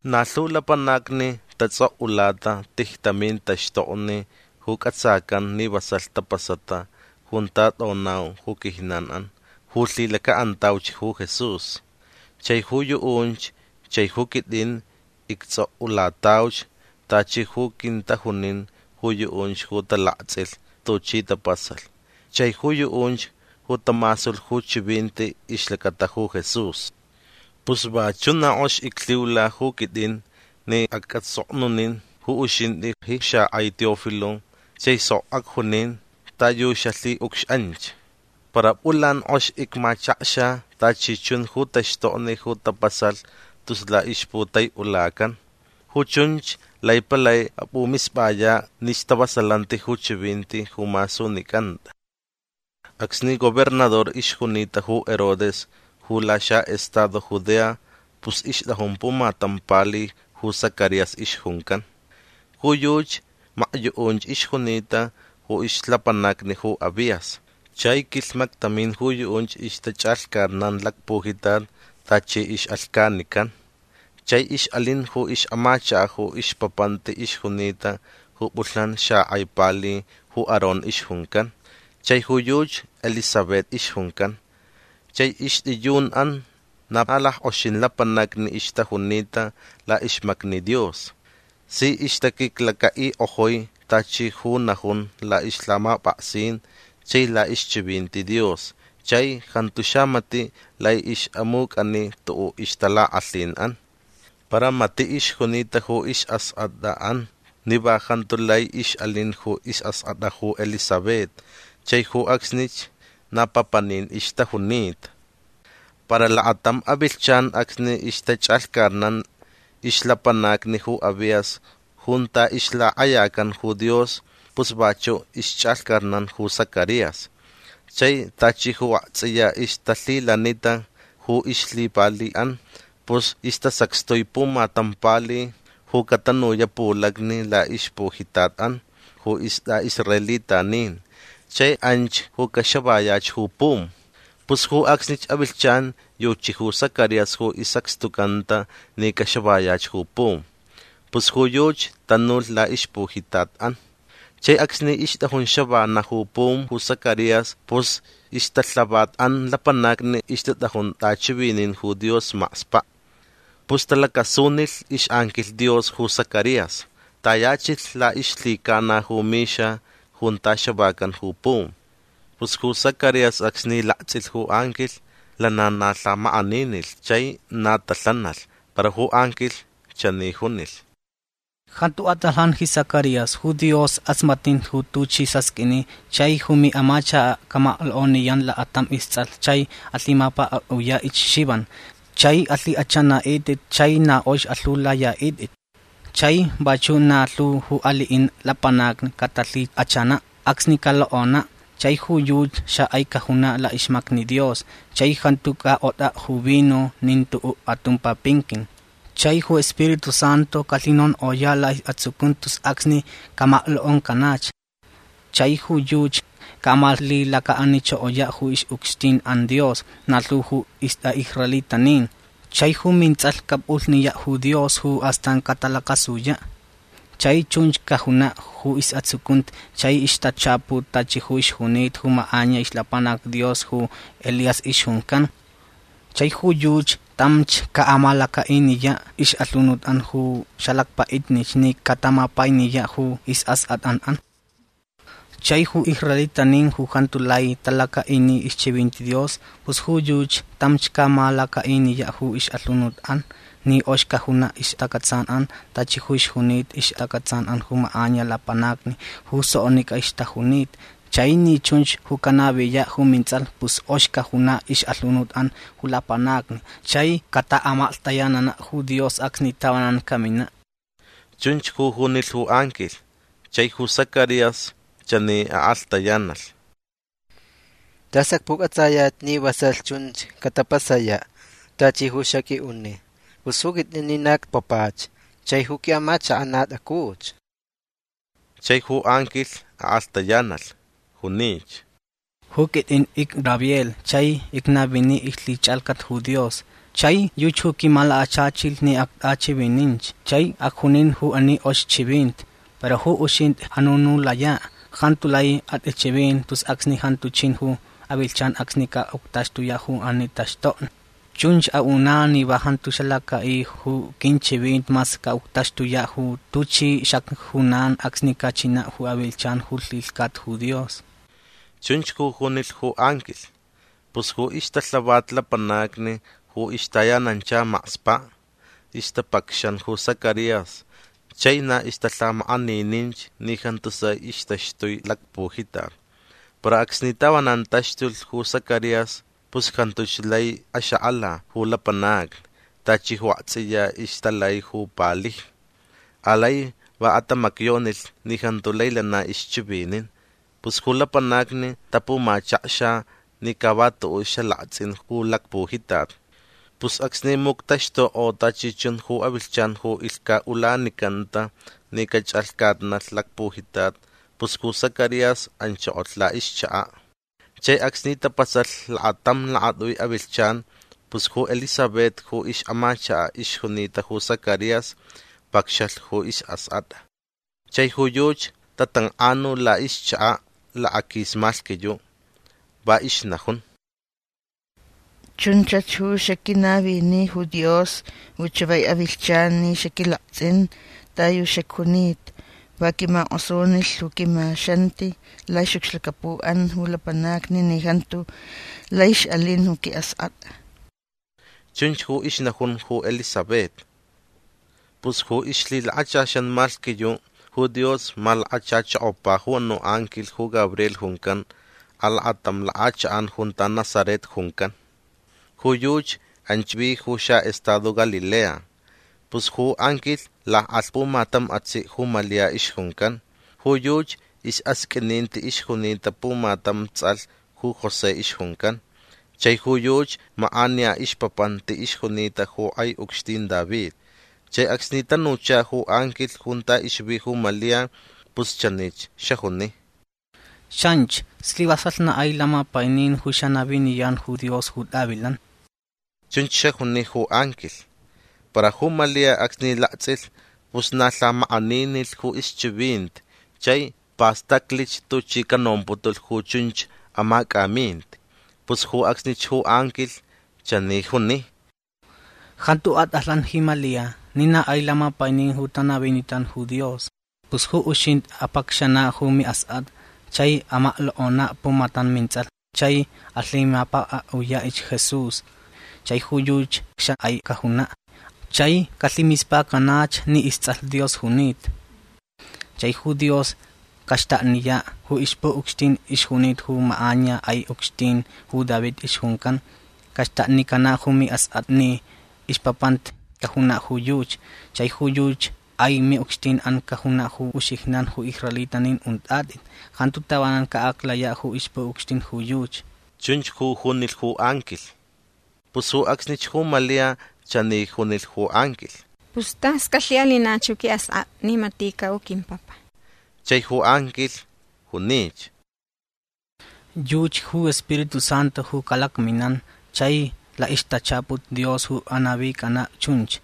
Na lhu lapanacni tatsʼokʼulata tijtamin taxtokni ju cʼatsacan ni vasalh tapasata junta tʼonau ju quijnanʼan ju lhilacaʼantauch ju Jesús. Chai ju yuʼunch chai ju quitʼin ictsʼokʼulatauch tachi ju quintajunin ju yuʼunch ju talaktsʼilh tuchi tapasalh chai ju yuʼunch ju tamasulh ju chivinti ixlacata ju Jesús. Pus vachuʼ na kʼox iclhiula ju quitʼin ni acʼatsʼoknunin ju uxintʼi ji xakʼai Teófilo chai sok acjunin ta yu xalhiʼucxʼanch. Para pʼulan kʼox icmachakxa tachi chun ju taxtokni ju tapasalh tus laʼixputaiʼulacan. Ju chunch lai palai apʼumispʼayaʼ ni stavasalanti ju chivinti ju masunicʼantʼa. Acsni gobernador ixjunita ju Herodes ju laxaʼestado Judea pus ixtʼajun pumatam pali ju Zacarías ixjuncan. Ju yuchi makyuʼunch ixjunita ju ixlapanacni ju Abías. Chai quilhmaktamin ju yuʼunch ixtachʼalhcatnan lacpujitat tachi ixʼalhcanican. Chai ixʼalin ju ixʼamachakaʼ ju ixpapanti ixjunita ju pʼulhnan xakʼai pali ju Aarón ixjuncan. Chai ju yuchi Elisabet ixjuncan. Chai ixtʼiyunʼan na lackʼoxin lapanacni ixtajunita laʼixmacni Dios. Si ixtaquiclacaʼikʼojui tachi ju najun laʼixlhamapʼaksin chai laʼixchivinti Dios chai jantu xamatiʼ lai ixʼamucʼani tuʼuʼ ixtalakʼalhinʼan. Para matiʼ ixjunita ju isʼaskʼatʼaʼan ni va jantu lai ixʼalin ju isʼaskʼatʼa ju Elisabet chai ju acsnich na papanin ixtajunita. Para lakatam avilhchan acsni ixtachʼalhcatnan ixlapanacni ju Abías junta ixlakʼayacan ju Dios pus vachuʼ ixchʼalhcatnan ju Zacarías. Chai tachi ju aktsʼiya ixtalhilanita ju ixlhipaliʼan pus istasacxtui pumatam pali ju catanuyaʼ pulacni laʼixpujitatʼan ju istʼaʼisraelitanin chai anch ju caxavayach ju pum. Pus ju acsnich avilhchan yuchi ju Zacarías ju isacxtucanta ni caxavayach ju pum. Pus ju yuchi tanulh laʼixpujitatʼan. Chai acsni ixtʼajun xavanaʼ ju pum ju Zacarías pus ixtalhavatʼan lapanacni ixtatʼajun tʼachivinin ju Dios makspaʼ. Pus talacasunilh ixʼanquilh Dios ju Zacarías. Tayachilh laʼixlhicana ju mixa junta xavacan ju pum. Pus ju Zacarías acsni laktsʼilh ju anquilh lana na lhamakʼaninilh chai na talhanalh. Para ju anquilh chani junilh: ―Jantu atʼalhan ji Zacarías. Ju Dios kʼasmatnin ju tuchʼi sasqʼuini chai ju miʼamachakaʼ camaklokʼoniyan lakatam istsʼalh chai alhimapʼakʼaʼuyaʼich Xivan. Chai alhikʼachʼanaʼitʼit chai na kʼox alhiulayaʼitʼit. Chai vachuʼ na lhu ju aliʼin lapanacni catalhikʼachanaʼ acsni calokʼonaʼ. Chai ju yuchi xakʼai cajunaʼ laʼixmacni Dios. Chai jantu cakʼotʼaʼ ju vino nin tuʼuʼ atumpa pinquin. Chai ju Spiritu Santu calhinonkʼoyaʼ laʼisʼatsucunti tus acsni camaklokʼoncanach. Chai ju yuchi caʼamalhilacaʼanichokoyaʼ ju ixʼucxtinʼan Dios na lhu ju istʼaʼisraelitanin. Chai ju mintsʼalh capʼulhniyaʼ ju Dios ju astan catalacasuyaʼ. Chai chunch cajunaʼ ju isʼatsucunti chai ixtachaput tachi ju ixjunita ju makʼaniya ixlapanac Dios ju Elías ixjuncan. Chai ju yuchi tamch caʼamalacaʼiniyaʼ ixʼalhunutʼan ju xalacpaʼitnich ni catamapainiyaʼ ju isʼaskʼatʼanʼan. Chai ju israelitanin ju jantu lai talacaʼini ixchivinti Dios pus ju yuchi tamch caʼamalacaʼiniyaʼ ju ixʼalhunutʼan ni kʼox cajunaʼ ixtacʼatsanʼan tachi ju ixjunita ixtacʼatsanʼan ju makʼaniya lapanacni ju soknicʼa ixtajunita. Chai ni chunch ju canaviyaʼ ju mintsʼalh pus kʼox cajunaʼ ixʼalhunutʼan ju lapanacni chai cataʼamaklhtayananaʼ ju Dios acsni tavanan caminaʼ. ―Chunch ju junilh ju anquilh. Chai ju Zacarías chani akʼalhtayanalh. ―Tas acpucʼatsayaʼ ni vasalh chunch catapasayaʼ tachi ju xaqʼuiʼuni. Pus ju quitʼin ni na icpapach chai ju quiʼamachakaʼ na tʼacuch. Chai ju anquilh akʼalhtayanalh. Junich: ―Ju quitʼin icGabriel chai icnavini ixlhichʼalhcat ju Dios. Chai yuchi ju quimalakachachilh ni actʼachivininch chai acjunin ju ani kʼox chivinti. Para ju uxintʼi anunulayaʼ. Jantu lai atʼichʼivin tus acsni jantu chin ju avilhchan acsni caʼuctaxtuyaʼ ju ani taxtokni. Chunch aʼunaʼ ni va jantu xalacʼaʼi ju quinchivinti mas caʼuctaxtuyaʼ ju tuchi xacjunan acsni cachinaʼ ju avilhchan ju lhilhcata ju Dios. ―Chunch ju junilh ju anquilh. Pus ju ixtalhavat lapanacni ju ixtayanancha makspaʼ ixtapacxan ju Zacarías chai na ixtalhamakʼanininch ni jantu sai ixtaxtui lacpujitat. Para acsni tavanan taxtulh ju Zacarías pus jantuch lai axakʼala ju lapanacni tachi ju aktsʼiya ixtalai ju palijni. Alai va atamacyonilh ni jantu lai lana ixchivinin. Pus ju lapanacni tapumachakxa ni ca va tuʼuʼ xalaktsʼin ju lacpujitat. Pus acsni muctaxtukʼo tachi chun ju avilhchan ju ilhcaʼulanicanta ni cachʼalhcatnalh lacpujitat pus ju Zacarías anchokolh laʼixchakaʼ. Chai acsni tapasalh lakatam lakatʼui avilhchan pus ju Elisabet ju ixʼamachakaʼ ixjunita ju Zacarías pacxalh ju isʼaskʼatʼa. Chai ju yuchi tatankʼanu laʼixchakaʼ lakaquis malhquiyuʼ. Va ixnajun: “Chunchach ju xaquinavini ju Dios ju chavai avilhchan ni xaquilaktsʼin ta yu xacjunita. Va quimakʼosunilh ju quimaxanti laʼixʼucxlacapuʼan ju lapanacni ni jantu lai ixʼalin ju quiʼaskʼatʼa”. ―Chunch ju ixnajun ju Elisabet. Pus ju ixlhilakachaxan malhquiyuʼ ju Dios malakachachokopa ju anuʼ anquilh ju Gabriel juncan alakatam lakʼachakʼan junta Nazaret juncan. Ju yuchi anch vi ju xaʼestado Galilea. Pus ju anquilh lakʼalh pumatam atsiʼ ju Malia ixjuncan. Ju yuchi isʼasqʼuininti ixjunita pumatam tsʼalh ju José ixjuncan. Chai ju yuchi makʼaniya ixpapanti ixjunita ju kʼai ucxtin David. Chai acsni tanucha ju anquilh junta ixvi ju Malia pus chanich xajuni: ―Xanchi. Slivasalh na kʼai lamapainin ju xanaviniyan ju Dios ju tʼavilan. ―Chunch xajuni ju anquilh. Para ju Malia acsni laktsʼilh pus na lhamakʼaninilh ju ixchivinti chai pastaclich tuchi canomputulh ju chunch amacʼaminti. Pus ju acsnich ju anquilh chani juni: ―Jantu atʼalhan ji Malia ni na kʼai lamapainin ju tanavinitan ju Dios. Pus ju uxintʼi apʼacxanaʼ ju miʼaskʼatʼa. Chai amaklokʼonaʼ pumatam mintsʼalh. Chai alhimapʼakʼaʼuyaʼich Jesús. Chai ju yuchi xakʼai cajunaʼ. Chai calhimispacanach ni istsʼalh Dios junita. Chai ju Dios caxtakniyaʼ ju ixpuʼucxtin ixjunita ju makʼaniya kʼai ucxtin ju David ixjuncan. Caxtaknicanaʼ ju miʼaskʼatʼa ni ixpapanti cajunaʼ ju yuchi. Chai ju yuchi kʼai miʼucxtinʼan cajunaʼ ju uxijnan ju israelitanin untʼatʼit. Jantu tavanan caʼaclayaʼ ju ixpuʼucxtin ju yuchi. ―Chunch ju junilh ju anquilh. Pus ju acsnich ju Malia chani junilh ju anquilh: ―Pus tas calhiʼalinach ju quiʼaskʼatʼa ni matiʼcaʼ ju quimpapa. Chai ju anquilh junich: ―Yuchi ju Spiritu Santu ju calakminan chai laʼixtachaput Dios ju anavicʼanaʼ chunch.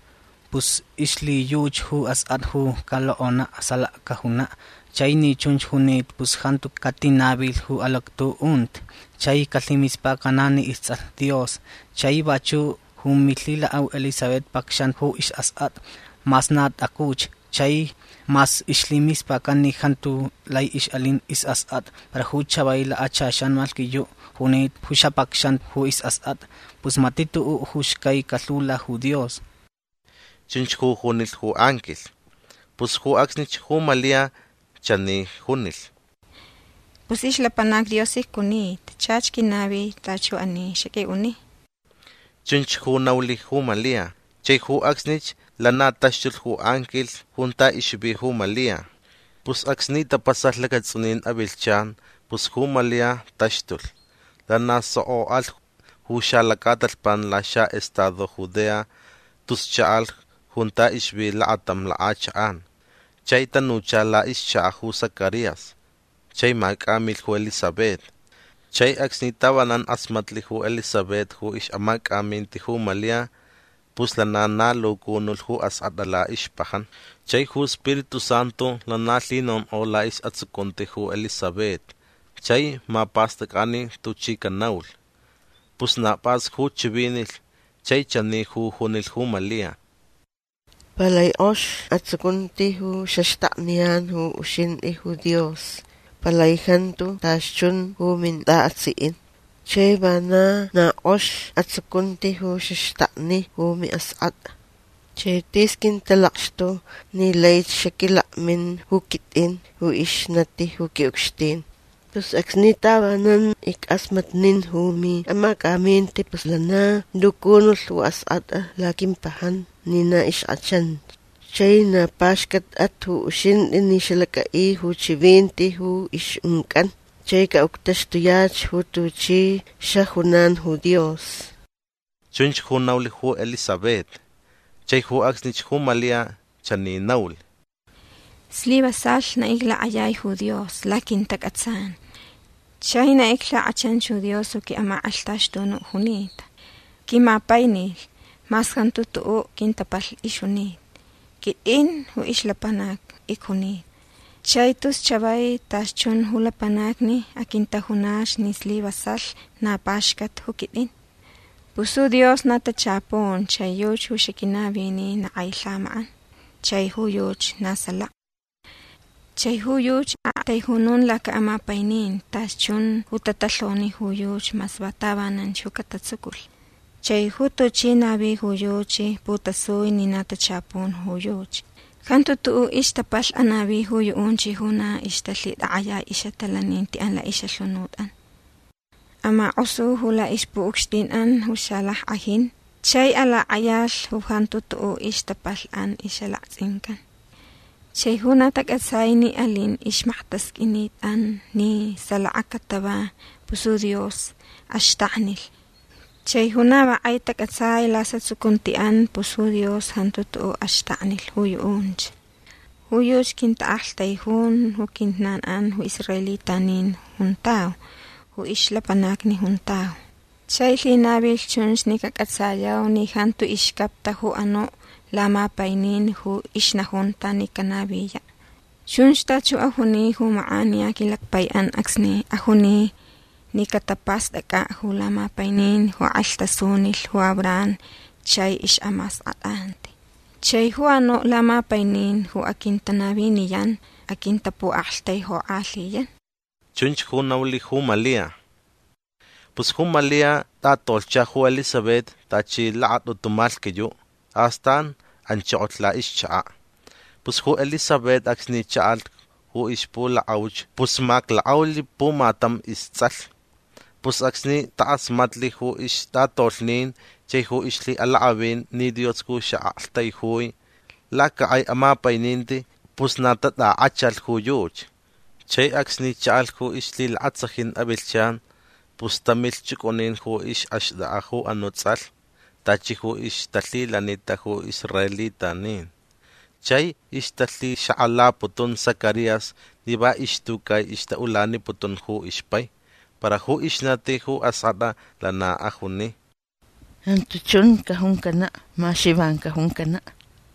Pus ixlhiyuchi ju askʼatʼa ju calokʼonaʼ salaka cajunaʼ. Chai ni chunch junita pus jantu catinavilh ju alactuʼunti. Chai calhimispacanaʼ ni istsʼalh Dios. Chai vachuʼ ju milhilakʼau Elisabet pacxanta ju isʼaskʼatʼa mas na tʼacuch. Chai mas ixlhimispacan ni jantu lai ixʼalin isʼaskʼatʼa para ju chavai lakachaxan malhquiyuʼ junita ju xapacxanta ju isʼaskʼatʼa. Pus matiʼ tuʼuʼ ju xcai calhiula ju Dios. ―Chunch ju junilh ju anquilh. Pus ju acsnich ju Malia chani junilh: ―Pus ixlapanac Dios icjunita. Chach quinavi tachi ju ani xaqʼuiʼuni. ―Chunch ju naulh ju Malia. Chai ju acsnich lana taxtulh ju anquilh junta ixvi ju Malia. Pus acsni tapasalh lacatsʼunin avilhchan pus ju Malia taxtulh. Lana soko alh ju xalacatalhpan laxaʼestado Judea tus chaʼalh junta ixvi lakatam lakʼachakʼan. Chai tanucha laʼixchakaʼ ju Zacarías chai macʼamilh ju Elisabet. Chai acsni tavanan kʼasmatlh ju Elisabet ju ixʼamacʼaminti ju Malia pus lana na lucunulh ju askʼatʼa laʼixpajan. Chai ju Spiritu Santu lana lhinonkʼo laʼisʼatsucunti ju Elisabet chai mapastʼacʼani tuchi canaulh. Pus na pʼas ju chivinilh chai chani ju junilh ju Malia: ―Palai kʼox atsucunti ju xaxtakniyan ju uxintʼi ju Dios. Palai jantu tachi chun ju mintʼaʼatsiʼin. Chai vana na kʼox atsucunti ju xaxtakni ju miʼaskʼatʼa. Chai tis quintalakxtu ni laich xaquilakmin ju quitʼin ju ixnati ju quiʼucxtin. Pus acsni tavanan ickʼasmatnin ju miʼamacʼaminti pus lana lucunulh ju askʼatʼa laquimpajan ni na ixkʼachanch. Chai na paxcatʼat ju uxintʼi ni xalacʼaʼi ju chivinti ju ixʼuncʼan. Chai caʼuctaxtuyach ju tuchi xajunan ju Dios. ―Chunch ju naulh ju Elisabet. Chai ju acsnich ju Malia chani naulh: ―Slivasalh na iclakʼayai ju Dios laquintacʼatsan. Chai na iclhikʼachanch ju Dios ju quiʼamakʼalhtaxtunuʼ junita. Quimapainilh mas jantu tuʼuʼ quintapalhni ixjunita. Quitʼin ju ixlapanac icjunita. Chai tus chavai tachi chun ju lapanacni aquintajunach ni slivasalh na paxcat ju quitʼin. Pus ju Dios na tachapun chai yuchi ju xaquinavini na kʼai lhamakʼan. Chai ju yuchi na salaka. Chai ju yuchi aʼaktaijunun lacaʼamapaininti tachi chun ju tatalhoni ju yuchi mas va tavananch ju catatsuculh. Chai ju tuchi navi ju yuchi putasui ni na tachapun ju yuchi. Jantu tuʼuʼ ixtapalhni anavi ju yuʼunch ju na ixtalhitakʼayai ixʼatalanintiʼan laʼixʼalhunutʼan. Amakʼosu ju laʼixpuʼucxtinʼan ju xalackʼajin. Chai alakʼayalh ju jantu tuʼuʼ ixtapalhniʼan ixʼalaktsʼincan. Chai ju na tacʼatsai ni alin ixmaktasqʼuinitʼan ni salaka catava pus ju Dios axtaknilh. Chai ju na va kʼai tacʼatsai ju laʼisʼatsucuntiʼan pus ju Dios jantu tuʼuʼ axtaknilh ju yuʼunch. Ju yuchi quintaʼaktaijun ju quijnanʼan ju israelitanin juntau ju ixlapanacni juntau. Chai lhinavilh chunch ni cacʼatsayau ni jantu ixcapta ju anuʼ lamapainin ju ixnajunta ni canaviyaʼ. Chunch tachi ju ajuni ju makʼaniya quilacpaiʼan acsni ajuni ni capastʼacʼaʼ ju lamapainin ju kʼalhtasunilh ju Abraham chai ixʼamaskʼatʼanti. Chai ju anuʼ lamapainin ju aquintanaviniyan aquintapuʼaktaijukʼalhiyan. ―Chunch ju naulh ju Malia. Pus ju Malia tʼatolhcha ju Elisabet tachi lakatʼutu malhquiyuʼ. Astan anchokolh laʼixchakaʼ. Pus ju Elisabet acsni chaʼalh ju ixpulakʼauch pus maklakʼaulh pumatam istsʼalh. Pus acsni takʼasmatlh ju ixtʼatolhnin chai ju ixlhiʼalakʼavin ni Dios ju xaʼaktaijui lacakʼai amapaininti pus na tatʼakʼachalh ju yuchi. Chai acsni chaʼalh ju ixlhilakatsajin avilhchan pus tamilh chʼucʼunin ju ixʼaxtʼakʼa ju anuʼ tsʼalh tachi ju ixtalhilanita ju israelitanin. Chai ixtalhixakʼalaputun Zacarías ni va ixtucai ixtaʼulaniputun ju ixpai. Para ju ixnati ju askʼatʼa lana ajuni: ―Jantu chun cajuncanaʼ. Ma Xivan cajuncanaʼ.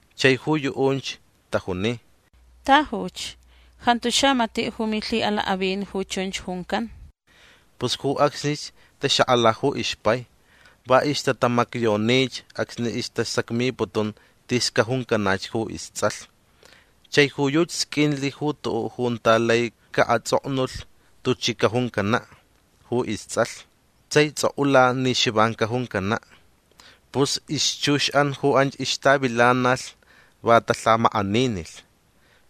Chai ju yuʼunch tajuni: ―Tajuch. Jantu xamatiʼ ju milhiʼalakʼavin ju chunch juncan. Pus ju acsnich taxakʼala ju ixpai. Va ixtatamacyonich acsni istasacmiputun tis cajuncanach ju istsʼalh. Chai ju yuchi sqʼuinlh ju tuʼuʼ junta lai caʼatsʼoknulh tuchi cajuncanaʼ ju istsʼalh. Chai tsʼokʼulalh ni Xivan cajuncanaʼ. Pus ixchuxʼan ju anch ixtavilanalh va talhamakʼaninilh.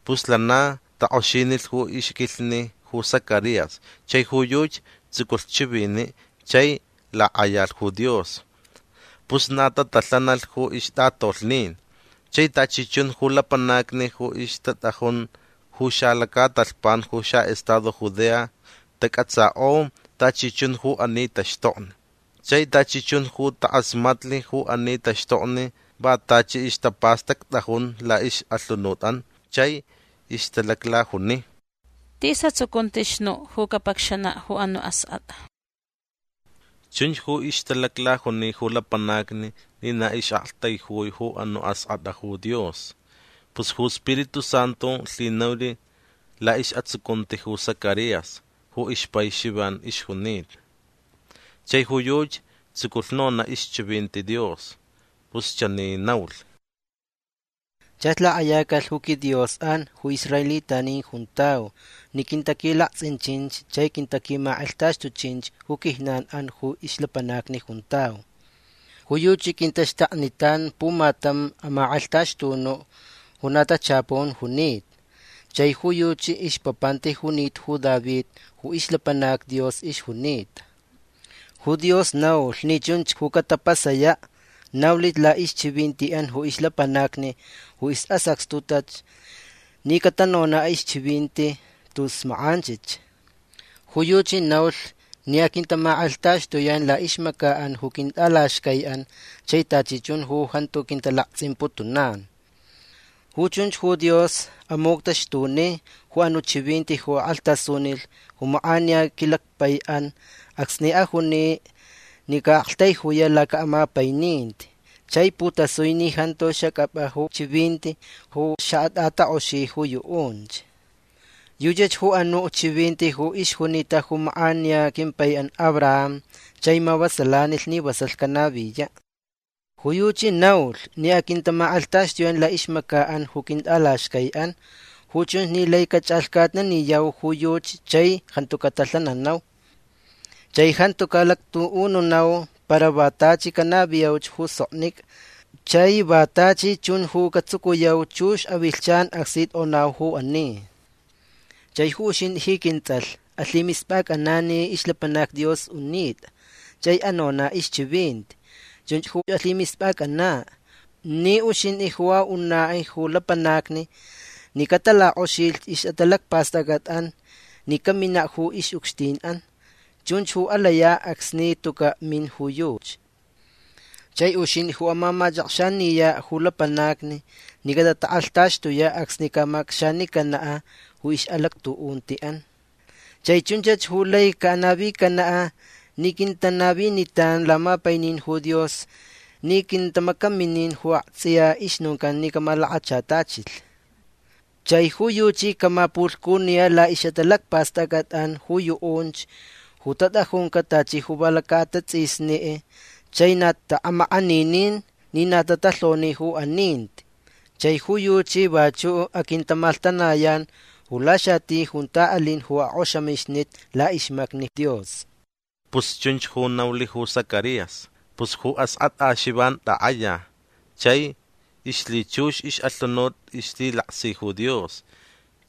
Pus lana takʼoxinilh ju ixquilhni ju Zacarías chai ju yuchi tsuculh chiviniʼ chai lakʼayalh ju Dios. Pus na tatalhanalh ju ixtʼatolhnin. Chai tachi chun ju lapanacni ju ixtatʼajun ju xalacatalhpan ju xaʼestado Judea tacʼatsakʼo tachi chun ju ani taxtokni. Chai tachi chun ju takʼasmatlh ju ani taxtokni va tachi ixtapastactʼajun laʼixʼalhunutʼan. Chai ixtalaclajuni: ―Tis atsucunti nuʼ ju capacxanaʼ ju anuʼ askʼatʼa. Chunch ju ixtalaclajuni ju lapanacni ni na ixʼaktaijui ju anuʼ askʼatʼa ju Dios. Pus ju Spiritu Santu lhinaulh laʼisʼatsucunti ju Zacarías ju ixpai Xivan ixjunita. Chai ju yuchi tsuculh nonaʼ ixchivinti Dios. Pus chani naulh: ―Chach lakʼayacalh ju quiDiosʼan ju israelitanin juntau ni quintaquilaktsʼinchinch chai quintaquimalakxtuchinch ju quijnanʼan ju ixlapanacni juntau. Ju yuchi quintaxtaknitan pumatam amakʼalhtaxtunuʼ ju na tachapun junita. Chai ju yuchi ixpapanti junita ju David ju ixlapanac Dios ixjunita. Ju Dios naulh ni chunch ju catapasayaʼ. Naulich laʼixchivintiʼan ju ixlapanacni ju isʼasacxtuta ni catanonaʼ ixchivinti tus makʼanchich. Ju yuchi naulh ni aquintamakʼalhtaxtuyan laʼixmacaʼan ju quintʼalaxcaiʼan chai tachi chun ju jantu quintalaktsʼimputunan. Ju chunch ju Dios amuctaxtuni ju anuʼ chivinti ju akʼalhtasunilh ju makʼaniya quilacpaiʼan acsni ajuni ni caʼaʼaktaijuyach lacaʼamapaininti. Chai putasui ni jantu xacʼapʼa ju chivinti ju xaʼatʼatakʼoxi ju yuʼunch. Yuchach ju anuʼ chivinti ju ixjunita ju makʼaniya quimpaiʼan Abraham chai mavasalanilh ni vasalh canaviyaʼ. Ju yuchi naulh ni aquintamakʼalhtaxtuyan laʼixmacaʼan ju quintʼalaxcaiʼan. Ju chunch ni laich cachʼalhcatnaniyau ju yuchi chai jantu catalhananau. Chai jantu caʼalactuʼununau para va tachi canaviyau ju soknicʼa. Chai va tachi chunch ju catsucuyau chux avilhchan acsni tʼonau ju ani. Chai ju uxintʼi ji quintsʼalh alhimispʼacʼanaʼ ni ixlapanac Dios unitʼa chai anonaʼ ixchivinti. Chunch ju alhimispʼacʼanaʼ ni uxintʼi ju aʼunaʼ ju lapanacni ni catalakʼoxilh ixʼatalacpastʼacʼatʼan ni caminaʼ ju ixʼucxtinʼan. Chunch ju alayaʼ acsni tucaʼ min ju yuchi. Chai uxintʼi ju amamachʼakxaniyaʼ ju lapanacni ni catatakʼalhtaxtuyaʼ acsni caʼamacʼacxanicanaʼ ju ixʼalactuʼuntiʼan. Chai chunchach ju lai caʼanavicanaʼ ni quintanavinitan lamapainin ju Dios ni quintamacaminin ju aktsʼiya ixnoncan ni camalakachatachilh. Chai ju yuchi camapulhcuniyaʼ laʼixʼatalacpastʼacʼatʼan ju yuʼunch ju tatʼajuncaʼ tachi ju va lacaʼatatsʼisni chai na taʼamakʼaninin ni na tatalhoni ju aninti. Chai ju yuchi vachuʼ aquintamalhtanayan ju laxati junta alin ju akʼoxamixnit laʼixmacni Dios. ―Pus chunch ju naulh ju Zacarías. Pus ju askʼatʼa Xivan takʼaya. Chai ixlhichux ixʼalhunut ixlhilaksi ju Dios.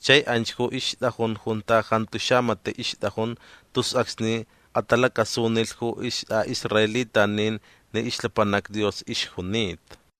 Chai anch ju ixtʼajun junta jantu xamatiʼ ixtʼajun tus acsni atalacasunilh ju istʼaʼisraelitanin ni ixlapanac Dios ixjunita.